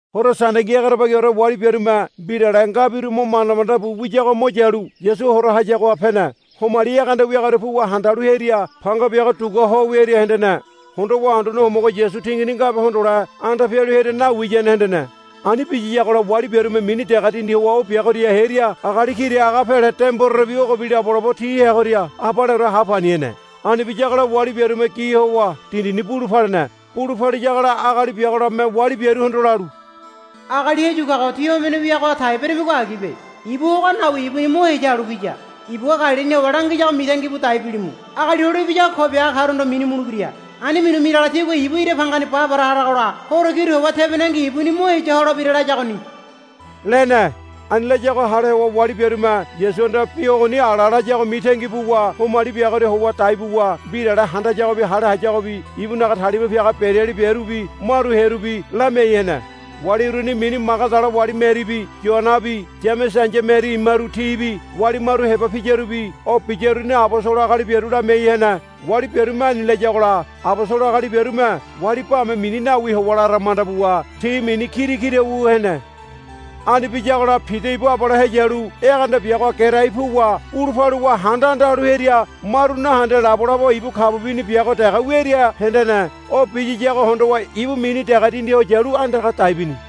Horo Sandengi egerebagiore wali biarume mbirale ngabiru mo manda manda bu wiyago mo yalu Yasu hora hayagoha pene. Homali egeanda wiagoria puwa handalu hearia panga biago dugua ho wiaria hendene. Hondowa Anduane Homogo Yasu tingini ngabe hondole anda pialu hearia nawiyane hendene. Ani biyiyagola wali biarume mini dege dindi howa o biagoria hearia agali kira aga pele de mborerebi ogobi labo labo ti heagoria abaleore ha pani hene. Ani biyagola wali biarume gi howa dindini bulu palene. Bulu paliyagola agali biago labome wali biaruhondo lalu, Agali heyu kago tí homene wiagaha tai beramigo agibe. Ibu ogoha nawi ibuni mo heya halu piya. Ibugua Galilini howa langiyago mitangi bu dai bilimu. Agali Hole Ibiyago ko biaga karuhondo minu mulebira. Ani minu miragola tigua ibu ira bangani ba para haragola horo kiru howa tebonengi ibuni mo heya holebira, layagoni, lene. Ani layago hale howa wali biarume Yasuhanda bi ogoni ala layago mitangi buwa homali biagoria howa dai buwa mbirale handayagobi hale hayagobi ibunaga talima piaga bereali biarubi maru hearubi lamiai hene. Wali uruni mini Magadala wali Meribi Yoanabi Yamese ai̱ya Meri imaru tibi wali maru heba piyarubi o biyaruni abosolo agali biaru lamiai hene. Wali biarume ani layagola abosolo agali biarume wali bame mini nawi howa lara manda buwa ti mini kira kira wu hene. Ani biyagola Pida ibu abale heyalu egeanda biagoha gerai puwa bulu paluwa handa anda halu hearia maru nahende labolabo ibu kabu bini biago dege wiaria hendene. O biyiyago hondowa ibu mini dege dindi ho yalu andaga dai bini.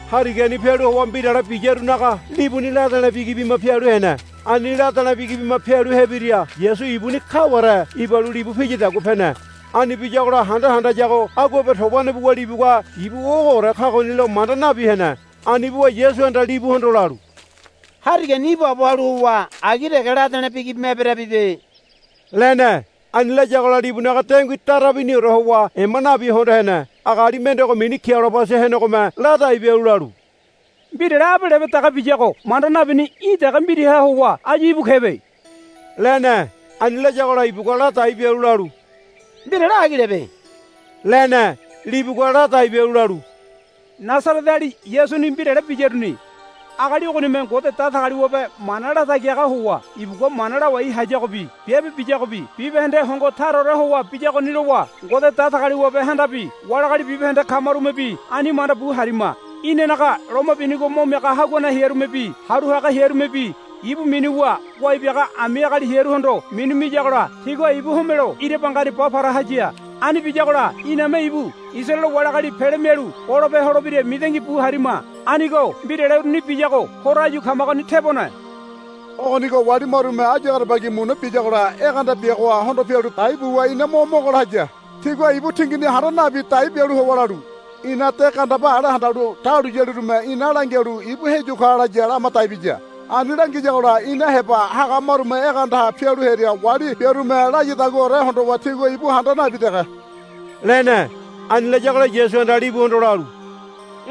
Harigani pialu howa mbirale biyarunaga libuni lade̱le̱ bigi bima pialu hene. Ani lade̱le̱ bigi bima pialu hebiria Yasu ibuni kaware ibalu libu piyadagua pene. Ani biyagola handa handayago aguabe tobane buwa libugua ibu ogoore kagonilo manda nabi hene. Ani buwa Yasuhanda libuhondo lalu, Harigani ibaabo halu howa agi dege lade̱le̱ bigi bima eberabibe, lene. Ani layagola libunaga dengui dara biniore howa ema nabi hondo hene. Agali mendego mini Kiliobasa henegome ladai bialu lalu, Mbirale abe lebe dege biyago manda nabini í̠ dege mbiraha howa áyu íbu kebe, lene. Ani layagola ibugua ladai bialu lalu, Mbirale agilebe, lene. Libugua ladai bialu lalu, Nasareteali Yasuni mbirale biyaruni. Agali ogonime Ngode Datagaliwabe mana latagi haga howa ibugua mana lawai hayagobi biabe biyagobi bibahende hongo taraore howa biyagoni lowa Ngode Datagaliwabehandabi wali agali bibahende kamarumebi ani manda bu harima. Inanaga loma binigo mo miaga haguane hearumebi haru haga hearumebi ibu minuwa wai biaga ami agali hearuhondo minu miyagola tigua ibu homelo ira bangani ba para haya. Ani biyagola iname ibu Isaraele wali agali pele mialu golope holebira mitangi bu harima. Anigo mbirale uruni biyago horo áyu kamagoni tebone. Ogonigo wali marume áyu egerebagi muna biyagola egeanda biagoha hondo pialu dai buwa ina mo mogola haya. Tigua ibu tingini handa nabi dai bialu howa lalu, Ina de gandeba ale handalu dahuliyalirume ina langialu ibu heyu ka laya, lama dai biya. Ani langiyagola ina heba haga marume egeandaha pialu hearia wali biarume layadaguaore hondowa tigua ibu handa nabi dege, lene. Ani layagola Yasuhanda libuhondo lalu,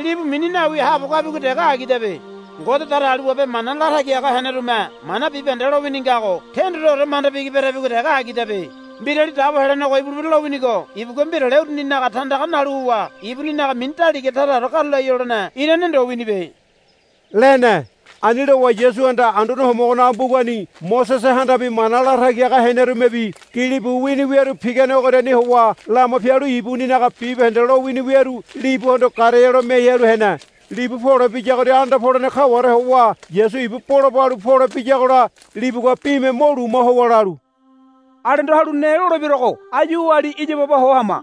Libu mini nawi haabo kabigo dege agidabe. Ngode Datagaliwabe mana latagi haga henerume mana bibahende lowini ngago tendoreore manda bigi berabigo dege agidabe. Mbirali Dabo Helenego ibulebira lowinigo ibugua mbirale uruninaga tandaga nalu howa ibuninaga mini daliga taraore karulai holene irane ndo winibe, lene. Ani lowa Yasuhanda Anduane Homogonaga mbugani Mosesehandabi mana latagi haga henerumebi gilibu wini wiaru pigane ogoriani howa lama pialu ibuninaga bibahende lowini wiaru libuhondo garealo miai halu hene. Libu pole biyagoria anda polene kaware howa Yasu ibu bola balu pole biyagola libugua bime mo luma howa lalu, Alendo halu ne lolebiaruago áyu oali iya baba ho hama,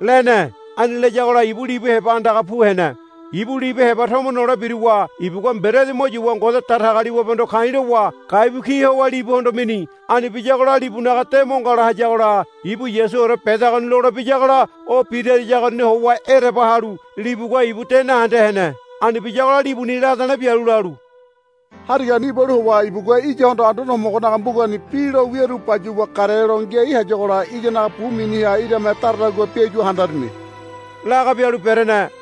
lene. Ani layagola ibu libu heba andaga pu hene. Ibu libu heba tomo nole biruwa ibugua mberedi mo yuwa Ngode Datagaliwabehondo ka̱i̱ lowa gaibu ki howa libuhondo mini. Ani biyagola libunaga de mo ngala hayagola ibu Yasuore bedagoni lole biyagola o birayagoriani howa ereba halu libugua ibu de nahende hene. Ani biyagola libuni lade̱le̱ bialu lalu, Harigani ibalu howa ibugua iyahondo Anduane Homogonaga mbugani bi lo wiaru bayuwa garealo ngiai hayagola iyanaga bu miniha irame daradagua biayua handarini, laga bialu berene.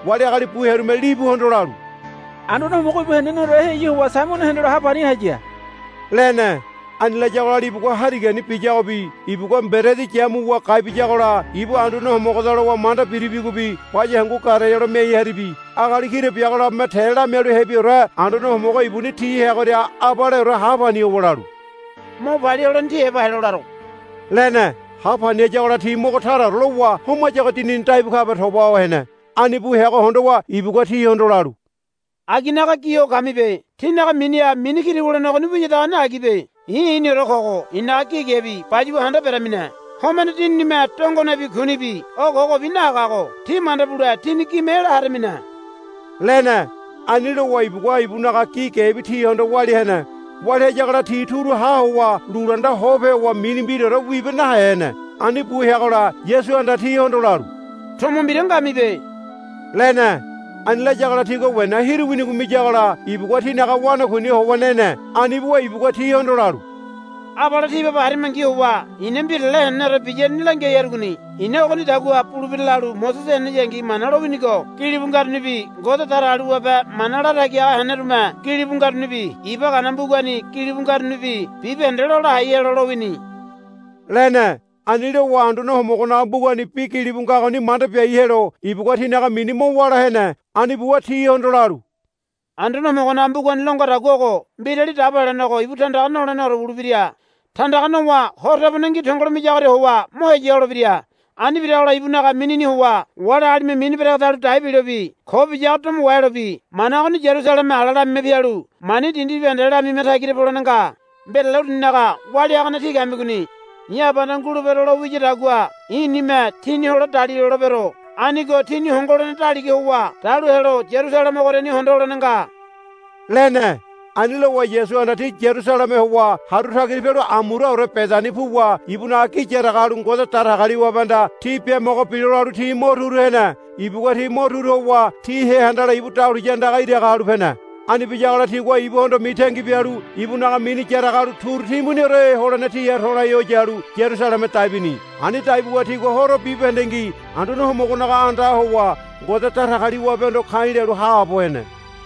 wali agali bu hearume libuhondo lalu, Anduane Homogo ibu heneneore heyu howa Saimono hendelo ha pani haya, lene. Ani layagola libugua harigani biyagobi ibugua mberedi yamuwa gai biyagola ibu Anduane Homogoda lowa manda biribigobi baya hangu garealo miai haribi. Agali kira biago labome te lamialu hebiore Anduane Homogo ibuni ti heagoria abaleore ha pani howa lalu, Mo palia holene tí heba helo laro, lene. Ha pani hayagola ti mogo taraore lowa homayago dinini daibu kabe toba ho hene. Ani bu heago hondowa ibugua tihondo lalu, Aginaga gi ho kamibe. Tínaga miniha mini kira wulene ogoni wiyadagoni agibe. I̱ i̱niore kogo i̱naga gi gebi bayuwa handa beramine. Homene dininime dongonebi kunibi o kogobi nahagago tí manda bule tíni gime ela haramine, lene. Ani lowa ibugua ibunaga gi gebi tihondo walia hene. Walia hayagola ti turu ha howa lulunda hope howa mini mbiraore wibe nahe hene. Ani bu heagola Yasuhanda tihondo lalu, Tomo mbira ngamibe, lene. Ani layagola tigua wena hiru winigo miyagola ibugua tinaga wanakuini howa nene. Ani buwa ibugua tihondo lalu, Abale tí baba harimangi howa i̱na mbirale heneneore biyaruni langiai harugoni. I̱na ogonidagua bulebira lalu Mosese heneyangi Mana lowinigo gilibu ngarunibi Ngode Datagaliwabe mana latagi haga henerume gilibu ngarunibi Iba Gana mbugani gilibu ngarunibi bibahende lola hai helo lowini, lene. Ani lowa Anduane Homogonaga mbugani bi gilibu ngagoni manda biai helo ibugua tinaga mini mo wála hene. Ani buwa tihondo lalu, Anduane Homogonaga mbugani lo ngadagua ogo, Mbirali Dabo Helenego ibu tandaga noleneore wulebira. Tandaga nowa horo tebonengi tongolo miyagoria howa mo heya holebira. Ani biragola ibunaga minini howa wali agalime mini beregedalu dai bilobi ko biyago domo wahelobi mana ogoni Yarusaleme ala lamima pialu mani dindi bibahendeha lamima tagira polene nga. Mbirale uruninaga walia hagane tí kamigoni. I̱ Abahanda ngulebero lo wiyadagua i̱nime tíni hole dalilolebero. Anigo tíni hongo holene daliga howa dalu helo Yarusaleme ogoriani hondo holene nga, lene. Ani lowa Yasuhanda ti Yarusaleme howa haru tagira pialu amuraore Bedani puwa ibunaga gi yaraga halu Ngode Datagaliwabehanda ti biamogo bilo lalu ti mo turu hene. Ibugua ti mo turu howa ti hea handala ibu dahuliya andaga iraga halu pene. Ani biyagola tigua ibuhondo mitangi bialu ibunaga mini yaraga halu turu timbuniore holene tiha to̱lai ho yalu Yarusaleme dai bini. Ani dai buwa tigua horo bibahendengi Anduane Homogonaga andaha howa Ngode Datagaliwabehondo ka̱i̱ lalu haabo hene.